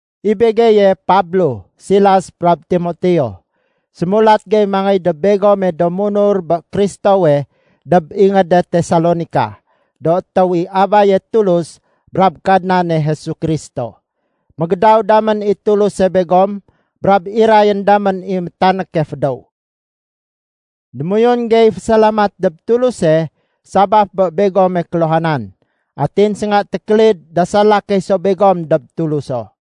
I begeye Pablo, Silas brab Timoteo, sémulat gey mangéy dob begome do munur bé Kristowe dob ingéde Tesalonika, do étéw i Abaye Tulus brab Kadnane Jesu Kristo. Mégédaw damén i Tuluse begom brab irayén damén i métanéke fédéw. Démoyun gey fésalamat dob Tuluse sabaf bé begome kéluhanan, atin sénga tékélid dasala key so begom dob Tuluso.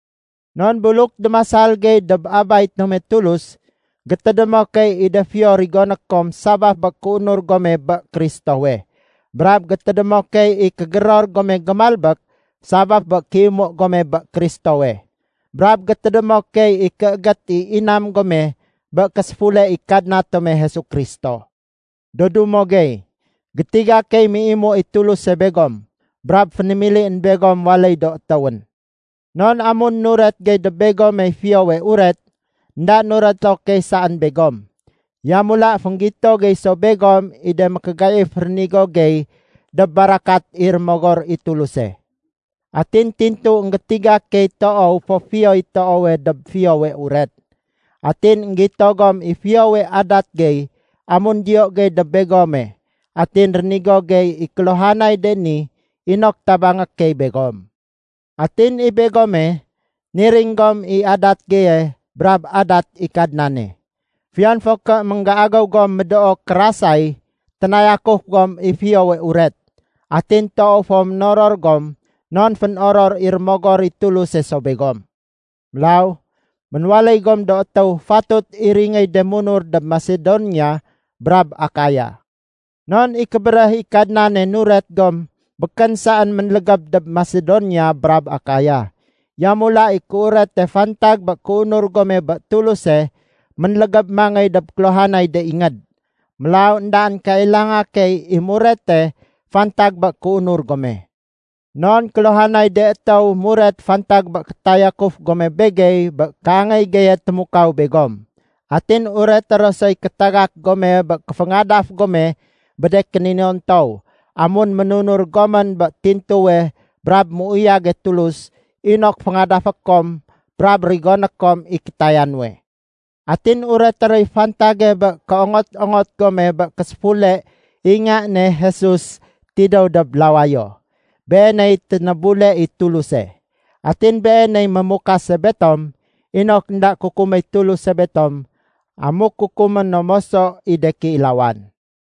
Non buluk démasal gey dob Abay tome Tulus, gétédémo key i de fiyo rigoné kom sabaf bé kéunur gome bé Kristowe. Brab gétédémo key i kégéror gome gémalbék sabaf bé kéimu gome bé Kristowe. Brab gétédémo key i kéégét i inam gome bé késéfule i Kadna tome Jesu Kristo. Do dumo gey, gétiga key méimu i Tuluse begom brab fénémilién begom waléy do étéwén. Non amun nuret gey dob begomey Fiyowe Uret, énda nureto key saén begom, yamula fénggito gey so begom i de mékégaif rénigo gey dob barakat i Rémogor i Tuluse. Atin tintu énggétiga key toow fo fiyoy toowe dob Fiyowe Uret. Atin énggito gom i fiyowe adat gey amun diyo gey dob begome atin rénigo gey i kéluhanay de ni inok tabangé key begom. Atin i begome, niring gom i adat geye brab adat i Kadnane. Fiyon fo ké ménggéagéw gom médoo kérasay, ténayakuf gom i Fiyowe Uret. Atin toow fo ménoror gom, non fénoror i Rémogor i Tuluse so begom. Mélaw, ménwaléy gom do étéw fatut iringéy de munur dob Masedonia brab Akaya. Non i kébéréh i Kadnane nuret gom békén saén ménlégéb dob Masedonia brab Akaya. Yamula i kéurete fantag bé kéunur gome bé Tuluse ménlégéb mangéy dob kéluhanay de ingéd. Mélaw éndaén kailanga key i murete fantag bé kéunur gome. Non kéluhanay de étéw muret fantag bé kétayakuf gome begey bé kéangéy geye témukaw begom. Atin ureté ro soy kétagak gome bé kéféngadaf gome bé de kéninontow amun ménunur gomén bé tintuwe brab méuyage Tulus inok féngadafé kom brab rigoné kom i kétaya nuwe. Atin ureté roy fantage bé kéongot-ongot gome bé késéfule i Nga ne Jesus tidéw dob lawayo. Beeney ténébule i Tuluse. Atin Beeney mémukase betom inok énda kukuméy Tuluse betom amuk kukumé no moso i de kéilawan.